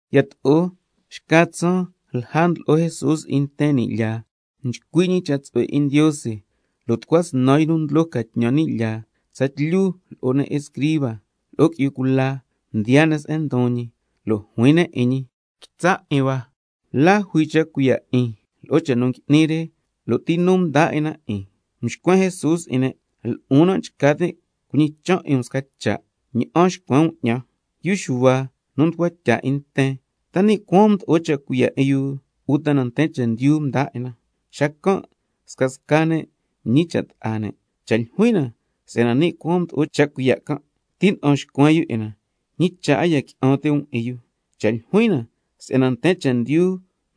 Yato'o xca tsaan lja ndlo'o Jesús 'in nten ni' lyaa, nchcui' ñi cha' tsu'hue 'in Ndiose, lo' tucua snan yu nu ndlo ca tñan ni' lyaa, tsatlyu lo'o ne' escriba, lo'o qui'yu cula mdiyaa ne' se'en ndon ñi, lo' juin ne' 'in ñi: Quitsa' 'in hua, ¿la jui cha' cuiya' 'in lo'o cha' nu ngui'ni re, lo' ti nu mdaa 'in na 'in? Mxcuen Jesús 'in ne': Lo'on nan' nchca tin' cuñichan' 'in um sca cha', cha' ña'an xcuen um 'ñan. Yu Xuhua nu mducua tya 'in nten, ¿ta ni' cuaan mdo'o cha' cuiya' 'in yu, uta na nten chendyu mdaa 'in na? Xacan' scasca ne' mñicha' ta'a ne': Cha' ljuin na si'yana ni' cuaan mdo'o cha' cuiya' can', tina'an xcuen yu 'in na, ¿ñi cha' a ya qui'an ti' um 'in yu? Cha' ljuin na si'yana nten chendyu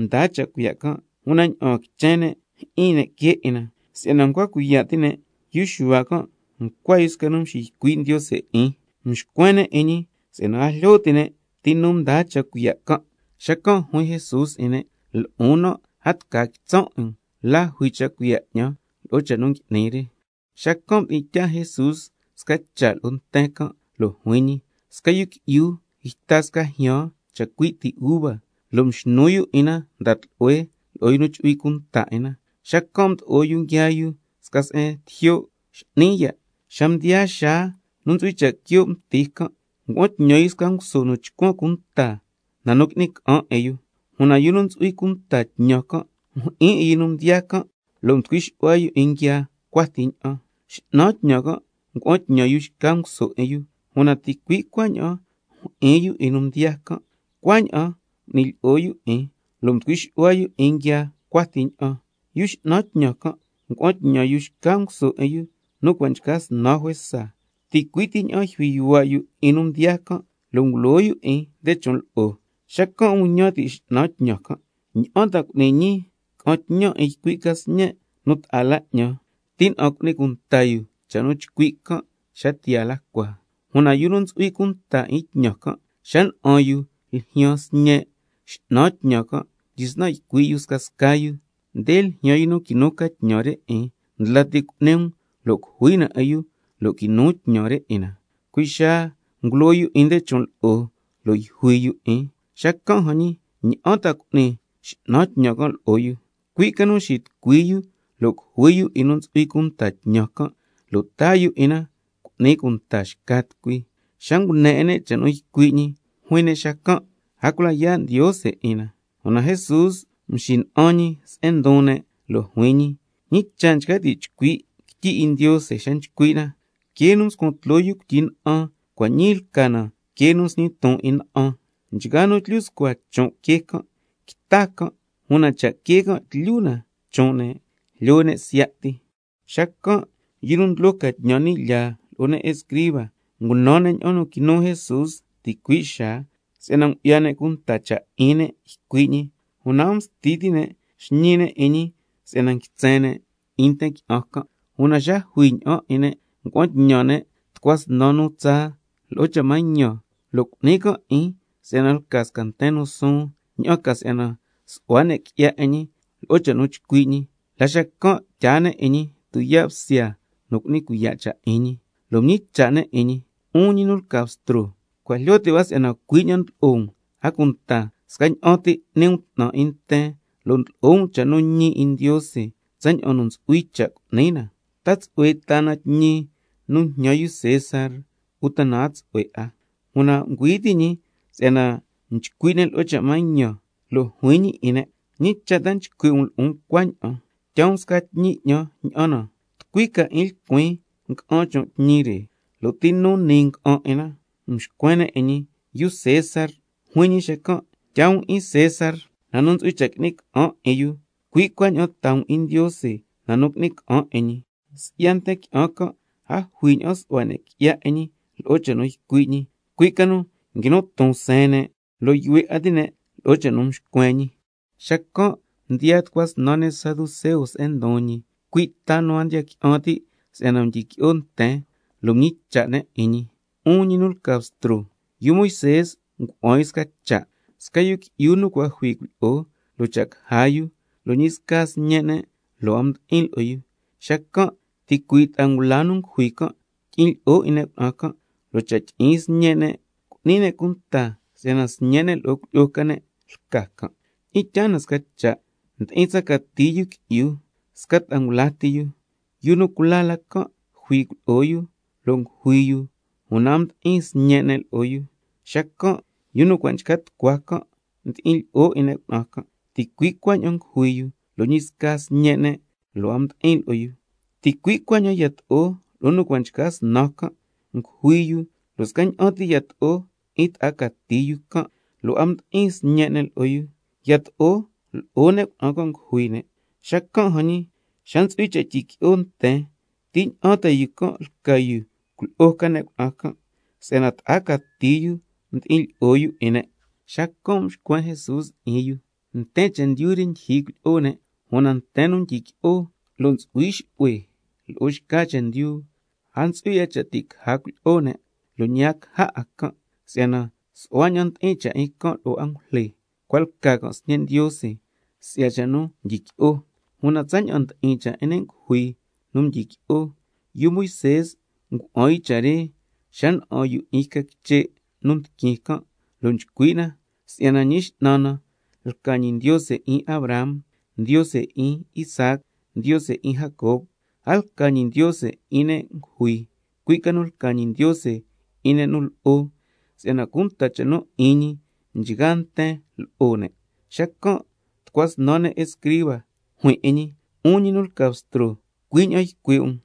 mdaa cha' cuiya' can', una ña'aan quichen ne' jyi'in ne' quee 'in na, si'yana ncua cuiya' ti' ne' yu Xuhua can' ncua yu sca nu mxiycui' Ndiose 'in. Mxcuen ne' 'in ñi si'yana a jlyo ti' ne' ti nu mdaa cha' cuiya' can'. Xacan' juin Jesús 'in ne': Lo'on nan' a tca quitsan' 'in um la jui cha' cuiya' 'ñan lo'o cha' nu ngui'nin re. Xacan' mdi'in tyaa Jesús sca cha' lo'o nten can' lo' juin ñi: Sca yu qui'yu yta sca jyan chacui' ti uva, lo' mxnu yu 'in na nda tlu'hue lo'o yu nu chu'hui cunta 'in na, xacan' mdo'o yu nguiaa yu sca se'en tijyo' x'ni ya'. Xa mdiyaa xaa nu ntsu'hui cha' quio' mti can', ngua'an tñan yu sca nguso nu chcuan cunta na nu qui'ni ca'an 'in yu. Una yu nu ntsu'hui cunta tñan can' mjyi'in 'in yu nu mdiyaa can', lo' mducui xu'hua 'in yu nguiaa yu cua ti ña'an. X'nan tñan can' ngua'an tñan yu xca nguso 'in yu, una ticui' cuaña'an mjyi'in yu 'in nu mdiyaa can', cua' ña'an ti m'ni lyi'o yu 'in, lo' mducui xu'hua yu 'in nguiaa cua ti ña'an. Yu x'nan tñan can' ngua'an tñan yu xca nguso 'in yu, nu cua' nchca snan juesa, ticui' ti ña'an yjui yuhua' yu 'in nu mdiyaa can' lo' ngulo yu 'in nde chon' lo'o. Xacan' nguñan ti' x'nan tñan can': ¿Ña'an ta cu'nin ñii? Ca'an tñan ycui' ca sñen' nu ta'a la 'ñan, tina'an cu'ni cunta yu cha' nu nchcui' can' xa tiyaa la cua. Una yu nu ntsu'hui cunta 'in tñan can', xa na'an yu ljyaan sñe' x'nan tñan can' mdyisnan ycui' scasca yu: Nde ljyaan yu nu quinu ca tñan re 'in, ndla ti um lo' cujui na 'in yu lo' quinu tñan re 'in na. Cui' xaa ngulo yu 'in nde chon' lo'o, lo' yjui yu 'in. Xacan' jan ñi, ¿ña'an ta cu'ni x'nan tñan can' lo'o yu? Cui' ca nu xitucui yu lo' cujui yu 'in nu ntsu'hui cunta tñan can', lo' taa yu 'in na cu'ni cunta xca tucui. Xa ngune 'in ne' cha' nu ycui' ñi, juin ne' xacan': ¡A cula ya' Ndiose 'in na! Una Jesús mxina'an ñi se'en ndon ne' lo' juin ñi: ¿Ñi cha' nchca ti' chcui' quityi 'in Ndiose xa nchcui' na: —Quee nu mscuan tloo yu cuityi na'an, cua' ñii lca na quee nu nsñi ton 'in na'an—? Nchgaa nu tlyu scua chon' quee can', quita can', una cha' quee can' tyu na chon' ne', jlyo ne' siya' ti. Xacan' yu nu ndlo ca tñan ni' lyaa lo'o ne' escriba ngunan ne' ña'an nu quinu Jesús ticui' xaa, si'yana ngu'ya ne' cunta cha' 'in ne' ycui' ñi, una a msti ti' ne' xñi ne' 'in ñi si'yana nguitsen ne' 'in nten quichen can'. Una xa jui ña'an 'in ne' ngua'an tñan ne' tucua snan nu tsaa lo'o cha' mañan, lo' cu'ni can' 'in si'yana lca sca nten nu suun, ña'an ca si'yana su'hua ne' qui'ya 'in ñi lo'o cha' nu chcui' ñi, la xacan' tyaa ne' 'in ñi tuyaa' bsya nu cu'ni cuiya' cha' 'in ñi. Lo' mñicha' ne' 'in ñi: 'Un ñi nu lca Bstro, cua' jlyo ti' hua si'yana cui' ña'an ndlo'o um, a cunta scaña'an ti n'ni um 'tnan 'in nten, lo' ndlo'o um cha' nu ñi 'in Ndiose tsaña'an nu ntsu'hui cha' cu'ni na. ¿Ta ti' tsu'hue taa na tñi nu njñan yu César, uta na a tsu'hue 'a? Una ngüi ti' ñi si'yana nchcui' ne' lo'o cha' mañan, xacan' juin ñi 'in ne': ¿Ñi cha' ta nchcui' um lo'on cuaña'an? Tyaa um sca tñi 'ñan, ña'an na. ¿Tucui ca 'in lcuin nga'an chon' tñi re, lo' ti nu niin nga'an 'in na? Xacan' mxcuen ne' 'in ñi: Yu César. Juin ñi xacan': Tyaa um 'in César na nu ntsu'hui cha' qui'ni ca'an 'in yu, cui' cuaña'an taa um 'in Ndiose na nu qui'ni ca'an 'in ñi. Si'ya nten qui'an can' a jui ña'an su'hua ne' qui'ya 'in ñi lo'o cha' nu ycui' ñi, cui' ca nu nguinu ton seen ne' lo' yuhue 'a ti' ne' lo'o cha' nu mxcuen ñi. Xacan' mdiyaa tucua snan ne' saduceo se'en ndon ñi, cui' nu a ndiya qui'an ti' si'yana ntsu'hui cha' tyiqui'o nten, lo' mñicha' ne' 'in ñi: 'Un ñi nu lca Bstro, yu Moisé ndeña'an ngua'an yu sca cha': —Sca yu qui'yu nu cua' jui cuilyi'o lo' cha' caja yu, lo' ñi sca sñe' ne' lo' a mdi'in lo'o yu, xacan' ticui' ta'a ngula nu ngujui can' tyi'in lyi'o 'in ne' cuna'an can', lo' cha' tyi'in sñe' ne' cu'ni ne' cunta si'yana sñe' ne' lo'o cuilyi'o ca ne' lca can'—. Tyi'in tyaa na sca cha', ndi'in tsa cati yu qui'yu, sca ta'a ngula ti yu. Yu nu cula la can' jui cuilyi'o yu, lo' ngujui yu, una a mdi'in sñe' ne' lo'o yu. Xacan' yu nu cua' nchca tucua can' mdi'in lyi'o 'in ne' cuna'an can', ticui' cuaña'an ngujui yu, lo' ñi sca sñe' ne' lo' a mdi'in lo'o yu. Ticui' cuaña'an yato'o lo'o nu cua' nchca snan can', ngujui yu, lo' scaña'an ti yato'o 'in ta'a cati yu can', lo' a mdi'in sñe' ne' lo'o yu. Yato'o lo'o ne' cuna'an can' ngujui ne'. Xacan' jan ñii, xa ntsu'hui cha' tyiqui'o nten, ¿ti ña'an yu can' lca cuilyi'o ca ne' cuna'an can', si'yana ta'a cati yu mdi'in lyi'o yu 'in ne'? Xacan' mxcuen Jesús 'in yu: Nten chendyu re ndyijyi cuilyi'o ne', una nten un tyiqui'o lo' ntsu'hui xu'hue lo'o xca chendyu, a ntsu'hui 'a cha' ti' caja cuilyi'o ne', lo' ñi a ntsu'hui 'a cha' ti' caja can', si'yana su'hua ña'an ndi'in cha' 'in lo'o angujle, cua' lca can' sñe' Ndiose si'ya cha' nu mdyiqui'o. Una tsaña'an ndi'in cha' 'in ne' ngujui nu ntsu'hui cha' tyiqui'o, yu Moisé ngua'an yu cha' re xa na'an yu 'in yca quiche' nu ndiquin can', lo' nchcui' na si'yana Ñi X'nan na lca ñi —Ndiose 'in Abraham, Ndiose 'in Isaac, Ndiose 'in Jacob—. A lca ñi Ndiose 'in ne' ngujui, cui' ca nu lca ñi Ndiose 'in ne' nu lo'o, si'yana cunta cha' nu 'in ñi nchgaa nten lo'o ne'. Xacan' tucua snan ne' escriba juin 'in ñi: 'Un ñi nu lca Bstro, cui' ña'an nu ycui' um.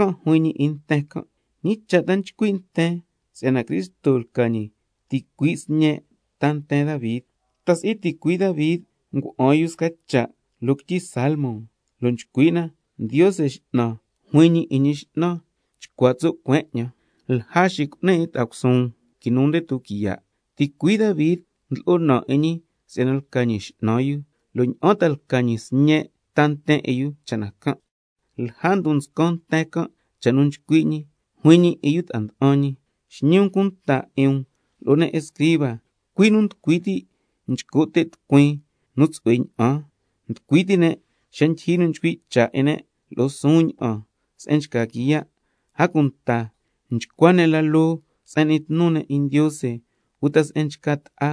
Xacan' juin ñi 'in nten can': ¿Ñi cha' ta nchcui' nten si'yana Cristo lca ñi ticui' sñe' ta nten 'in Davi? ¿Ta si'i ticui' Davi ngua'an yu sca cha' loo quityi Salmo, lo' nchcui' na: —Ndiose X'nan na juin ñi lo'o Ñi X'nan: Chcua tso' cueen 'ñan, lja xicu'nin 'in ta'a cusuun quinu nde tuquiya'—? Ticuii' Davi ndlo'o naan 'in ñi si'yana lca ñi X'nan yu, ¿lo' ña'an ta lca ñi sñe' ta nten 'in yu cha' na can'? Lja ndon nscan nten can' cha' nu nchcui' ñi, juin ñi 'in yu ta'a nda'an ñi: Xñi um cunta 'in um lo'o ne' escriba, cui' nu nducui ti' nchco' te' tucuin nu tsu'hue ña'an, nducui ti' ne' xa ndyijyi nu nchcui' cha' 'in ne' lo'o suun ña'an se'en nchca quiya', a cunta nchcua ne' la loo se'en n'ni tnu ne' 'in Ndiose uta se'en nchca ta'a,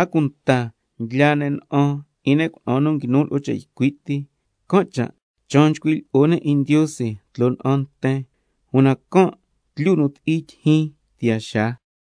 a cunta ndlyaa ne' na'an 'in ne' cuna'an nu nguinu lo'o cha' ycui' ti, can' cha' chaan nchcui' lyi'o ne' 'in Ndiose tloo na'an nten, una can' tlyu la nu ti'i tyijyin tiyaa xaa.